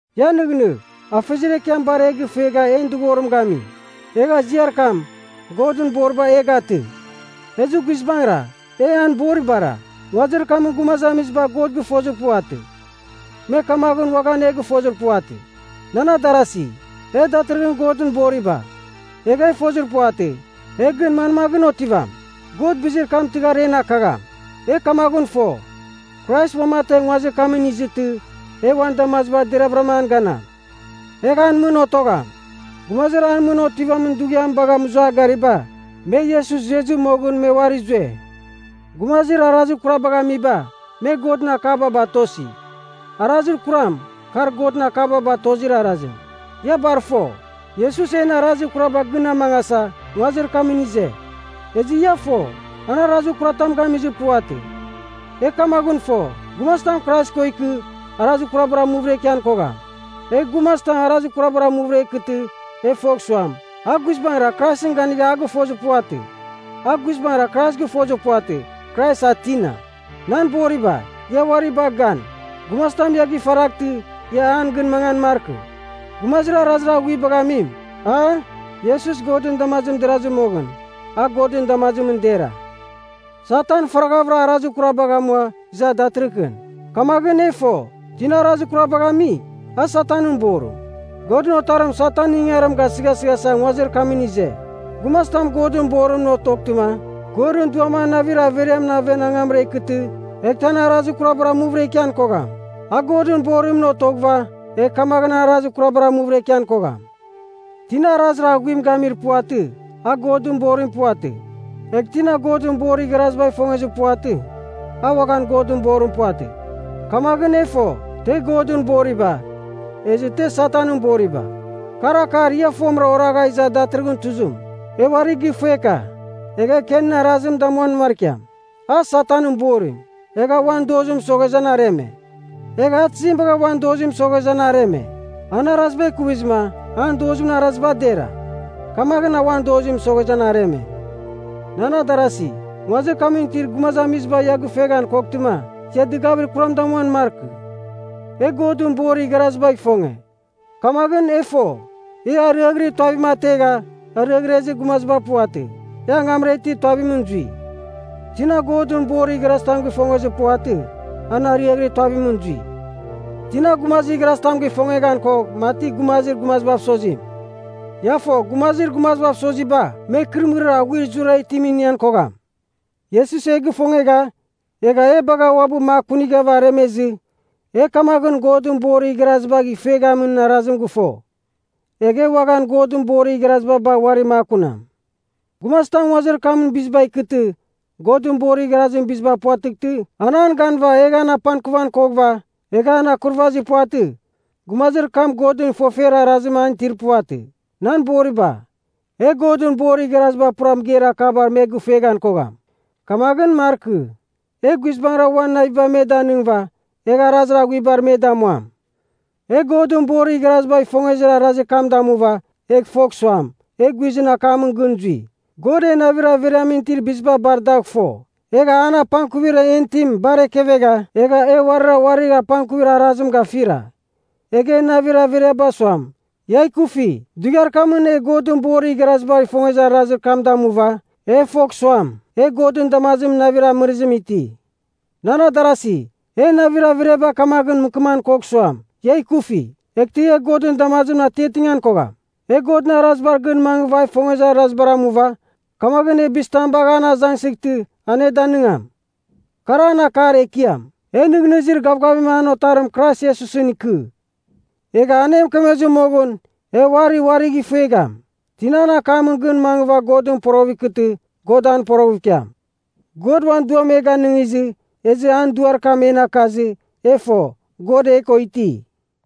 Ia nɨghnɨgh, Afeziar Ekiam bar e gɨfuegha en dɨghorim gami. Egha ziar kam, Godɨn boriba, e gatɨ. Ezɨ guizbangɨra, e an boribara. Nguazir kamɨn gumazamiziba God gɨfozir puvatɨ, me kamaghɨn uaghan e gɨfozir puvatɨ. Nan adarasi, e datɨrɨghɨn Godɨn boriba. Egha e fozir puvatɨ, e gɨn manmaghɨn otivam. God bizir kam tɨghar en akagham. E kamaghɨn fo, Krais uamategh nguazir kamɨn izɨtɨ, e uan damazibar deravɨra an ganam. Egh an mɨn otogham. Gumazir an mɨn otivamin dughiam bagha mɨzua gariba, me Iesus zuezɨ moghɨn me uari zue. Gumazir arazir kurabagh amiba, me Godɨn akaba batosi. Arazir kuram, kar Godɨn akaba batozir arazim. Ia bar fo, Iesus en arazir kuraba gɨn a mangasa, nguazir kamɨn ize. Ezɨ ia fo, an arazir kuratam gamizir puvatɨ. E kamaghɨn fo, gumazitam Krais ko ikɨ, arazir kurabar amuvɨra ikian kogham. Egh gumazitam arazir kurabar amuvɨra ikɨtɨ, e fogh suam, a guizbangɨra Kraisɨn ganigha a gɨfozir puvatɨ. A guizbangɨra Krais gɨfozir puvatɨ, Krais a tina. Nan boriba, ia uari bagh gan, gumazitam ia gifaraghtɨ, ia an gɨn mangan markɨ. Gumazir arazir aghuibagh amim, a, Iesus Godɨn damazimɨn derazɨ moghɨn, a Godɨn damazimɨn dera. Satan faraghavɨra arazir kurabagh amua iza datɨrɨkɨn. Kamaghɨn e fo, tina arazir kurabagh ami, a Satanɨn borim. Godɨn Otarim Satanɨn ingangarim gasɨghasɨghasa nguazir kamɨn ize. Gumazitam Godɨn borimɨn otoghtɨma, Godɨn Duam an navir averiamɨn aven angamra ikɨtɨ, eghtɨ an arazir kurabar amuvɨra ikian kogham. A Godɨn borimɨn otoghɨva, egh kamaghɨn an arazir kurabar amuvɨra ikian kogham. Tina arazir aghuim gamir puvatɨ, a Godɨn borim puvatɨ. Egh tina Godɨn borir igharazibagh ifongezir puvatɨ, a uaghan Godɨn borim puvatɨ. Kamaghɨn e fo, te Godɨn boriba, ezɨ te Satanɨn boriba. Kar akar ia fomɨra oragha iza datɨrɨghɨn tuzim: E uari gɨfuega. E Kenɨn arazim damuan markiam. A Satanɨn borim, egha uan dozim mɨsoghezɨ an areme. Egha a tizim bagha uan dozim mɨsoghezɨ, an areme? An araziba ikuvizɨma, an dozimɨn araziba dera. Kamaghɨn a uan dozim mɨsoghezɨ an areme. Nan adarasi, nguazir kamɨn itir gumazamiziba ia gɨfueghan koghtɨma, ia dɨgavir kuram damuan markɨ. E Godɨn borir igharazibagh ifonge. Kamaghɨn e fo, e ariaghɨrir tuavim ategha, ariaghrezir gumaziba puvatɨ, e angamra itir tuavimɨn zui. Tina Godɨn borir igharazitam gɨfongezir puvatɨ, an ariaghɨrir tuavimɨn zui. Tina gumazir igharazitam gifongeghan kogh mati gumazir gumazibav sozim. Ia fo gumazir gumazibav soziba, me ikɨrɨmɨrir aghuir zurara itim inian kogham. Iesus e gifongegha, egha e bagha uabɨ makunighava aremezɨ, e kamaghɨn Godɨn borir igharazibagh ifueghamin arazim gɨfo. Egh e uaghan Godɨn borir igharaziba bagh uari makunam. Gumazitam nguazir kamɨn biziba ikɨtɨ, Godɨn borir igharazim biziba puvatɨghtɨ, an an ganɨva, egh an apangkuvan koghɨva, egh an akurvazir puvatɨ, gumazir kam Godɨn ifofer arazim an itir puvatɨ. Nan boriba, e Godɨn borir igharaziba pura mɨgeir akabar me gɨfueghan kogham. Kamaghɨn markɨ. Egh guizbangɨra uan naviba me danɨngɨva, egh arazir aghuiba me damuam. E Godɨn borir igharazibagh ifongezir arazir kam damuva, e fogh suam, e guizɨn akamɨn gɨn zui. God en navir averiamɨn itir biziba bar dagh fo, egha an apangkuvir en itim bar ekevegha, egha e uarira uarir apangkuvir arazim gafira. Egh en navir averiaba suam, ia ikufi, dughiar kamɨn e Godɨn borir igharazibagh ifongezir arazir kam damuva, e fogh suam, e Godɨn damazimɨn navir amɨrɨzim iti. Nan adarasi, en navir averiaba kamaghɨn mɨkɨman koghan suam, ia ikufi, eghtɨ e Godɨn damazimɨn atiatingan kogham. E Godɨn arazibar gɨn mangɨva a ifongezir arazibar amuva, kamaghɨn e bizitam bagh an azangsɨghtɨ, an e danɨngam. Kar an akar ekiam: e nɨghnɨzir gavgavim an Otarim Krais Iesusɨn ikɨ. Egh an e mɨkemezir moghɨn, e uari uarigh ifuegham. Tina an akamɨn gɨn mangɨva a Godɨn poroghɨv ikɨtɨ, God an poroghɨv ikiam. God uan Duam e ganɨngizɨ, ezɨ an Duar kam en akazɨ, e fo, God e ko iti.